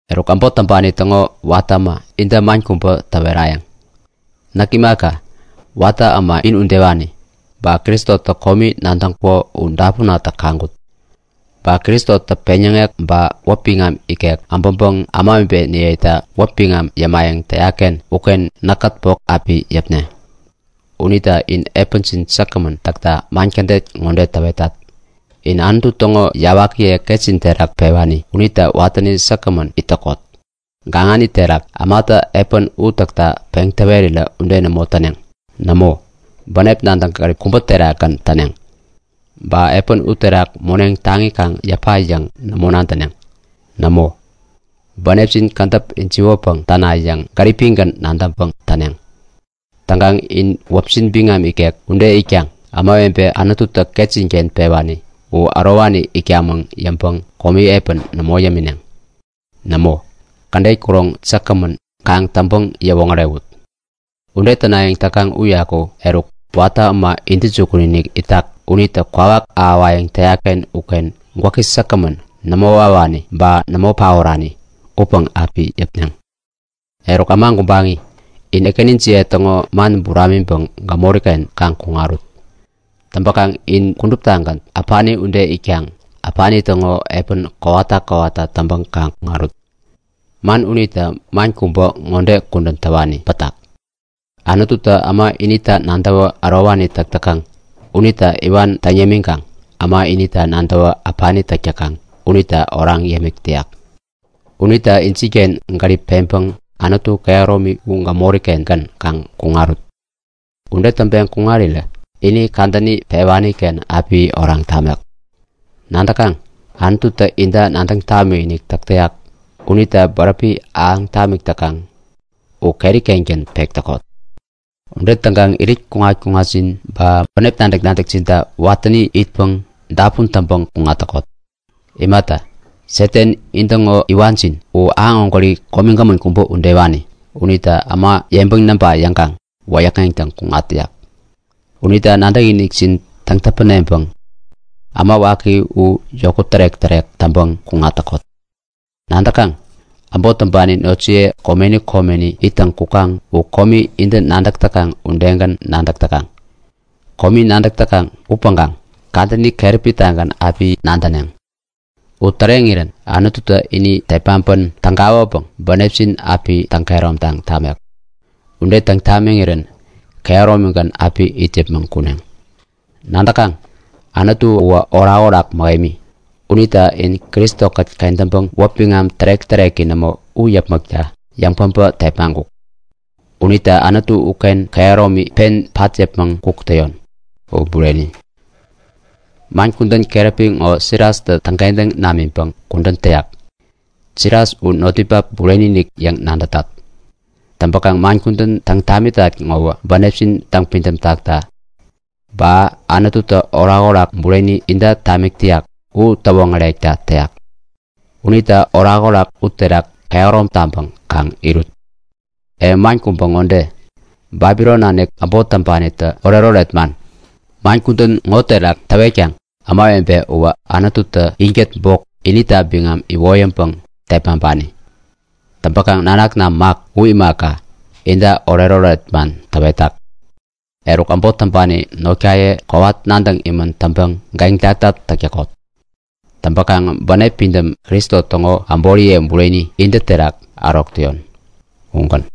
Eruk, äbot täŋpani täŋo watä äma inta man kubä täwerayäŋ. Näk imaka, watä äma in udewanigän, ba Kristotä komi nadäŋkuko u dapunatä kaŋkut. Ba Kristotä peŋyäŋek ba wäpi biŋam ikek äbäŋpäŋ ämawebeniyeta wäpi biŋam yämayäŋ täyak-ken uken näkkät bok api yäpne. Unita in epänjin säkgämän täkta man kädet ŋode täwetat; Inä Anutu täŋo yawakiye ketjin terak pewani unita watäni säkgämän it täkot. Gaŋani terak, ämatä epän u täkta peŋ täwerirä ude nämo täneŋ. Nämo, bänep nadäk-gärip kubä terakgän täneŋ. Ba epän uterak moneŋ taŋi kaŋ yäpna yäŋ nämo nadäneŋ. Nämo, bänepjin kädäp ijiwäpäŋ täna yäŋ gäripgän nadäŋpäŋ täneŋ. Täŋkaŋ in wäpjin biŋam ikek ude itkaŋ ämawebe Anututä ketjin-ken pewani u, ärowani itkamäŋ yäŋpäŋ komi epän nämo yämineŋ. Nämo, kädet kuroŋ säkgämän kaŋ täŋpäŋ-yäwoŋärewut. Ude tänayäŋ täkaŋ uyaku eruk Watä Äma Intäjukun-inik itak unitä kwawak ahäwayäŋ täyak-ken uken gwäki säkgämän, nämo wawani ba nämo paorani upäŋ api yäpneŋ. Eruk äma gubaŋi, in ekänijiye täŋo man buramiŋpäŋ gämori-ken kaŋ kuŋarut. Täŋpäkaŋ in kuduptagän äpani ude itkaŋ äpani täŋo kudän ude kowata kowata täŋpäŋ kaŋ kuŋarut. Man unita man kubä ŋode kudän täwani pätak; Anututä äma inita nadäwä ärowani täk täkaŋ unita iwan täŋ yämiŋkaŋ äma inita nadäwä äpani täk täkaŋ unita oraŋ yämik täyak. Unita injinken gärip peŋpäŋ Anutu Kehäromi u gämori-kengän kaŋ kuŋarut. Ude täŋpeŋ kuŋarirä ini kadäni pewani-ken api oraŋ tamek. Nadäkaŋ, Anututä inta nadäŋ tamikinik täk täyak unita bäräpi ahäŋ tamik täkaŋ u keri-kengän pek täkot. Ude täŋkaŋ irit kuŋat-kuŋatjin ba bänep nadäk-nadäkjinta watäni itpäŋ dapun täŋpäŋ kuŋat täkot. U imata, Satan, intäŋo iwanjin u, aŋ ägwäri komigämän kubä udewani unitä äma yeŋpäŋ näŋpa yäŋkaŋ wäyäkŋeŋtäŋ kuŋat täyak. Unita nadäkinikjin täŋ-täpäneŋpäŋ äma waki u yokut tärek-tärek täŋpäŋ kuŋat täkot. Nadäkaŋ? Äbot täŋpani notjiye komeni komeni ittäŋ kukaŋ u komi intä nadäk täkaŋ udegän nadäk täkaŋ. Komi nadäk täkaŋ upäŋkaŋ kadäni keräpi-tagän api nadäneŋ. U täreŋirän Anututä ini tepmaŋpän tägawäpäŋ bänepjin api täŋ-kehäromtaŋ tamek. Ude täŋ tamiŋirän kehäromigän api it yäpmäŋ kuneŋ. Nadäkaŋ? Anutu uwä orakorak mähemi. Unitä in Kristo-kät kentäŋpäŋ wäpi biŋam tärek-täreki nämo u yäpmäkta yäŋpäbä tepmaŋkuk. Unita Anutu uken kehäromi pen pat yäpmäŋ kuk täyon! U Bureni. Man kudän keräpi ŋo Silastä täŋkentäŋ namiŋpäŋ kudän täyak. Silas u notninpak bureni-inik yäŋ nadätat. Täŋpäkaŋ man kudän täŋ tamitat ŋowä bänepjin täŋpidäm takta, ba kädet Anututä orakoraki bureni inta tamik täyak u täwoŋärekta täyat. Unita orakorak uterak yeŋkehärom taŋpäŋ kaŋ irut! E man kubä ŋode; Babilon nanik äbot täŋpanitä oretoret man, man kudän ŋo terak täwetkaŋ. Ämawebe uwä Anututä inkät bok inita biŋam iwoyäŋpäŋ tepmaŋpani. Täŋpäkaŋ nanakna Mak u imaka, inta oretoret man täwetak. Eruk, äbot täŋpani notjiyekät not täŋpäŋ kowat iniŋ orerän täk täkot. Täŋpäkaŋ bänep pidäm, Kristo täŋo äboriye bureni intä terak ärok täyon. Ugän.